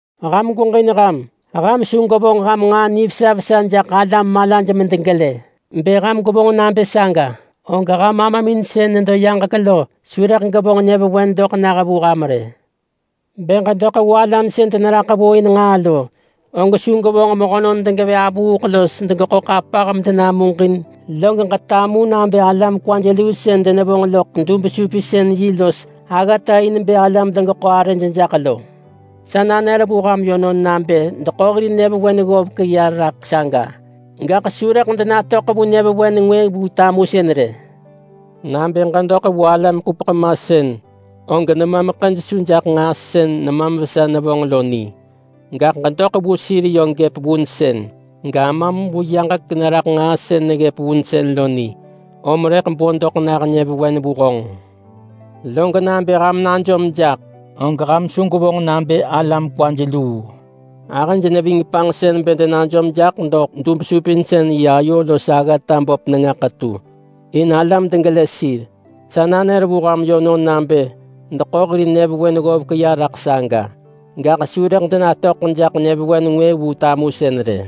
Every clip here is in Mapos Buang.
“Ham gweġin ham. Ham su gwevonġ ham nġaa nivesa vesa jaḳ alam malaj medegelë. Bë ham gwevonġ nabë saga, og ham Amamin sën nedo yaġek lo su rëḳ gevonġ nyëvewen vu ham rë. Bë ġedoḳ vu alam sën deneraḳ vu in nġaa lo, og su gwevonġ mehönon degevë avuuḳ los degeḳo ḳapah medenamuġin log ġetamu nabë alam kwaj luu sën denevonġ loḳ dub-supinsën-yi los aggata in bë alam degeḳo arëj jaḳ lo. Sa nanër vu ham yönon nabë deḳo hir nyëvewen ggovek ya raḳ saga, gaḳ su rëḳ denatöḳ vu nyëvewen ngwë vu tamusën rë. Nabë ġedoḳ vu alam-ḳupeḳ-masën, og nemam ḳëj su jaḳ nġaa sën nemam vesa nevonġ lo ni, gaḳ ġedoḳ vu sir yö gëp vunsën. GAmam vu yaġek neraḳ nġaa sën neggëp vunsën lo ni, om rëḳ bo doḳ nah nyëvewen vu honġ.” “Log nabë ham najom jaḳ, og ham su gwevonġ nabë alam kwaj luu rë. Ahëj neving panġsën bë denajom jaḳ doḳ dub-supinsën-yi ayo los aggata böp nenga ḳetu, in alam degelë sir. Sa nanër vu ham yönon nabë deḳo hir nyëvewen ggovek ya raḳ saga, gaḳ su rëḳ denatöḳ jaḳ nyëvewen ngwë vu tamusën rë.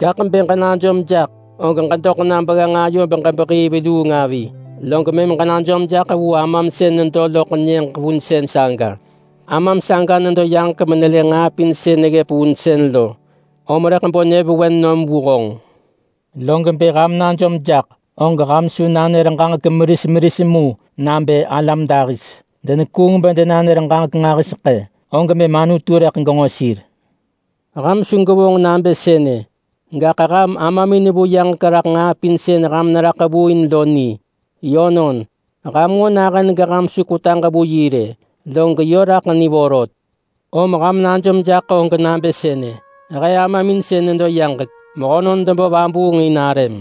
Gaḳ bë ġenajom jaḳ, og ġedoḳ na begganġ ayo beġebehii veluung avi, log mëm ġenajom jaḳ vu Amam sën nedo loḳ nyëġ vunsën saga. Amam saga nedo yaġek menelë nġaa pin sën neggëp vunsën lo, om rëḳ bo doḳ nah nyëvewen vu honġ. Log bë ham najom jaḳ, og ham su nanër ġaġek meris meris mu nabë alam dahis. Denekuung bë denanër ġaġek nġahiseḳë, og mëm Anutu rëḳ genġo sir. Ham su gwevonġ nabë sënë. Gaḳ ham Amamin vu yaġek raḳ nġaa pin sën ham neraḳ vu in lo ni. Yönon, ham nġo nahën geham su kwetaġ vu yi rë, log yö raḳ ni vorot. Om ham najom jaḳ nabë sënë: ‘He Amamin sën nedo yaġek, mehönon debo vabuung in arëm.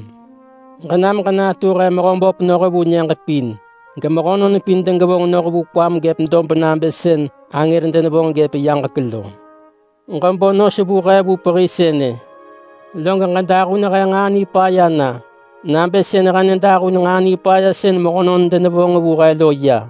Ġenam ġenatu he Mehöböp noh vu nyëġ pin, gemehönon pin degevonġ noh vu kwam gëp dob nabë sën angër denevonġ ggëp yaġek lo. Ġebo nos vu he vu pehi sënë. Lob ġedahun he nġaa nipaya na nabë sën he nedahun nġaa nipaya sën mehönon denevonġ vu he lo ya.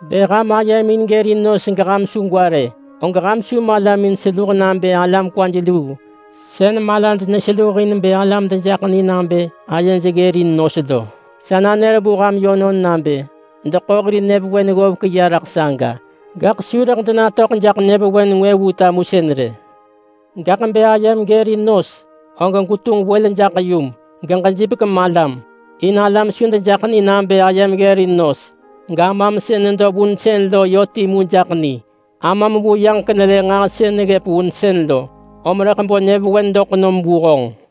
“Bë ham ayemin gërin nos geham su gwa rë, og ham su malamin seluh nabë alam kwaj luu sën malaj neseluh in bë alam dejaḳ ni nabë ayej ggërin nos lo. Sa nanër vu ham yönon nabë deḳo hir nyëvewen ggovek ya raḳ saga, gaḳ su rëḳ denatöḳ jaḳ nyëvewen ngwë vu tamusën rë. Gaḳ bë ayem gërin nos, og gwetunġ wël jaḳ yum, geġejipek malam, in alam su dejaḳ ni nabë ayem ggërin nos. GAmam sën nedo vunsën lo yö timu jaḳ ni. Amam vu yaġek nelë nġaa sën neggëp vunsën lo, om rëḳ bo doḳ nah nyëvewen vu honġ.”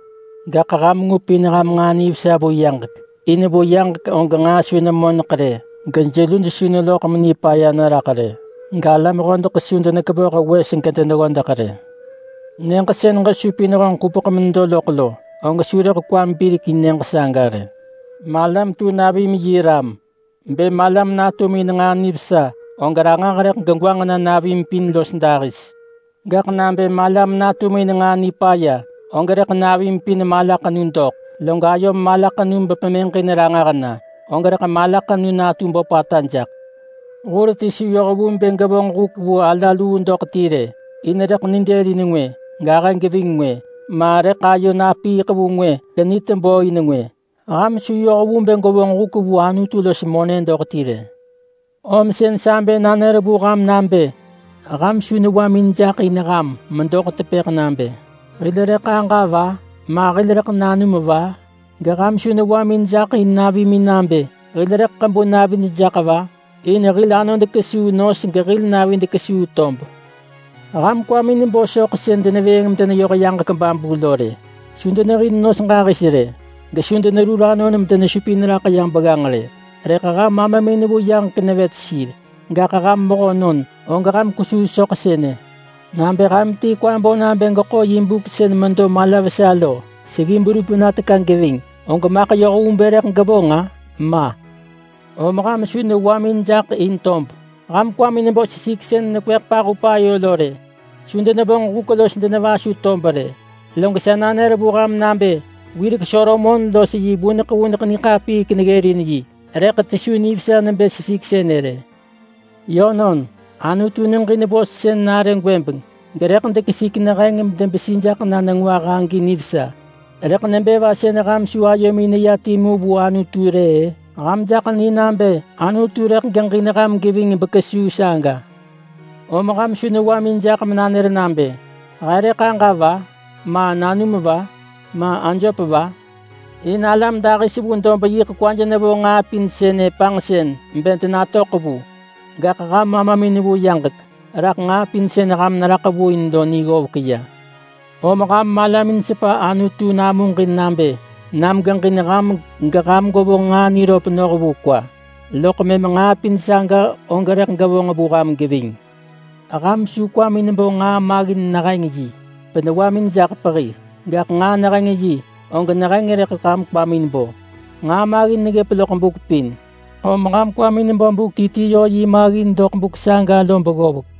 Gaḳ ham ngupin ham nġaa nivesa vu yaġek. In vu yaġek og nġaa su nemoneḳ rë, gejeluj su neloḳ menipaya neraḳ rë, galam hodeḳ su denekevoh wes gedeneggodeḳ ya rë. Nyëġ sën ham supin ham ḳupeḳ menedo loḳ lo, og ham su rëḳ kwamin birekin nyëġ saga rë.” “Malam tu navim yi ram. Bë malam natum in nġaa nivesa, og ranġah rëḳ gegwanġ na navim pin los dahis. Gaḳ nabë malam natum in nġaa nipaya, og rëḳ navim pin malaḳenu doḳ. Log ayom malaḳenu bë pemëġin ranġah na, og rëḳ malaḳenu natu böpata jaḳ.” “Hur ti su yoh vu bë gevonġ huk vu ala luu doḳ ti rë. In rëḳ nidëlin ngwë, gahë geving ngwë, ma rëḳ ayo napiiḳ vu ngwë genitebö in ngwë. Ham su yoh vu bë gwevonġ huk vu Anutu los monë doḳ ti rë.” “Om sën sa bë nanër vu ham nabë ham su newamin jaḳ in ham medoḳ tepëḳ nabë, ‘Hil rëḳ aġa va? Ma hil rëḳ nanum va?’ Geham su newamin jaḳ in navimin nabë, ‘Hil rëḳ ḳebu navid jaḳ va?’ In hil anod kesuu nos gehil navid kesuu tob. Ham kwamin bo soḳ sën denevëëng medeneyoh yaġek babu lo rë. Su denehin nos ġahis rë, gesu denerur anon bedenesupin raḳ ya begganġ rë, rëḳ ham Amamin vu yaġek nevet sir. Gaḳ ham mehönon, og ham kwesuu soḳ sënë. Nabë ham ti kwa bo nabë geḳo yi buk sën medo mala vesa lo seggi berup na teka geving, og maḳ yoh vu bë rëḳ gevonġ-a? Ma! Om ham su newamin jaḳ in tob! Ham kwamin bo sesik talohek sën nekweḳ pahup ayo lo rë. Su denevonġ huk los denevasu tob rë, log sa nanër vu ham nabë wirek Solomon los yi vuneḳ-vuneḳ niḳapiik neggërin yi, rëḳ ti su nivesa nebë sesik sënë rë. Yönon, Anutu neġin nivesa vos sën nare gwëbeng, gerëḳ dekesik neheng bedebesi jaḳ na nengwah. Om nebë va sën ham su ayomin neya timu vu Anutu rë-ë? Ham jaḳ ni nabë Anutu rëḳ geġin ham geving bekesuu saga. Om ham su newamin jaḳ menanër nabë, ‘He rëḳ aġa va? Ma nanum va? Ma ajöp va?’ In alam dahis vu dob yiḳ kwaj nevo nġaa pin sënë panġsën bë denatöḳ vu. Gaḳ ham Amamin vu yaġek raḳ nġaa pin sën ham neraḳ vu in lo ni ggovek ya. Om ham malamin sepa Anutu namuġin nabë nam geġin ham geham gwevonġ nġaa niröp noh vu kwa, loḳ mëm nġaa pin saga og rëḳ gevonġ vu ham geving. Ham su kwamin bo nġaa maggin neheng yi benewamin jaḳ pehi. Gaḳ nġaa neheng yi, og neheng rëḳ ham kwamin bo. Nġaa maggin neggëp loḳ buk pin, om ham kwamin bo buk ti ti yö yi maggin doḳ buk saga lo beggovek.”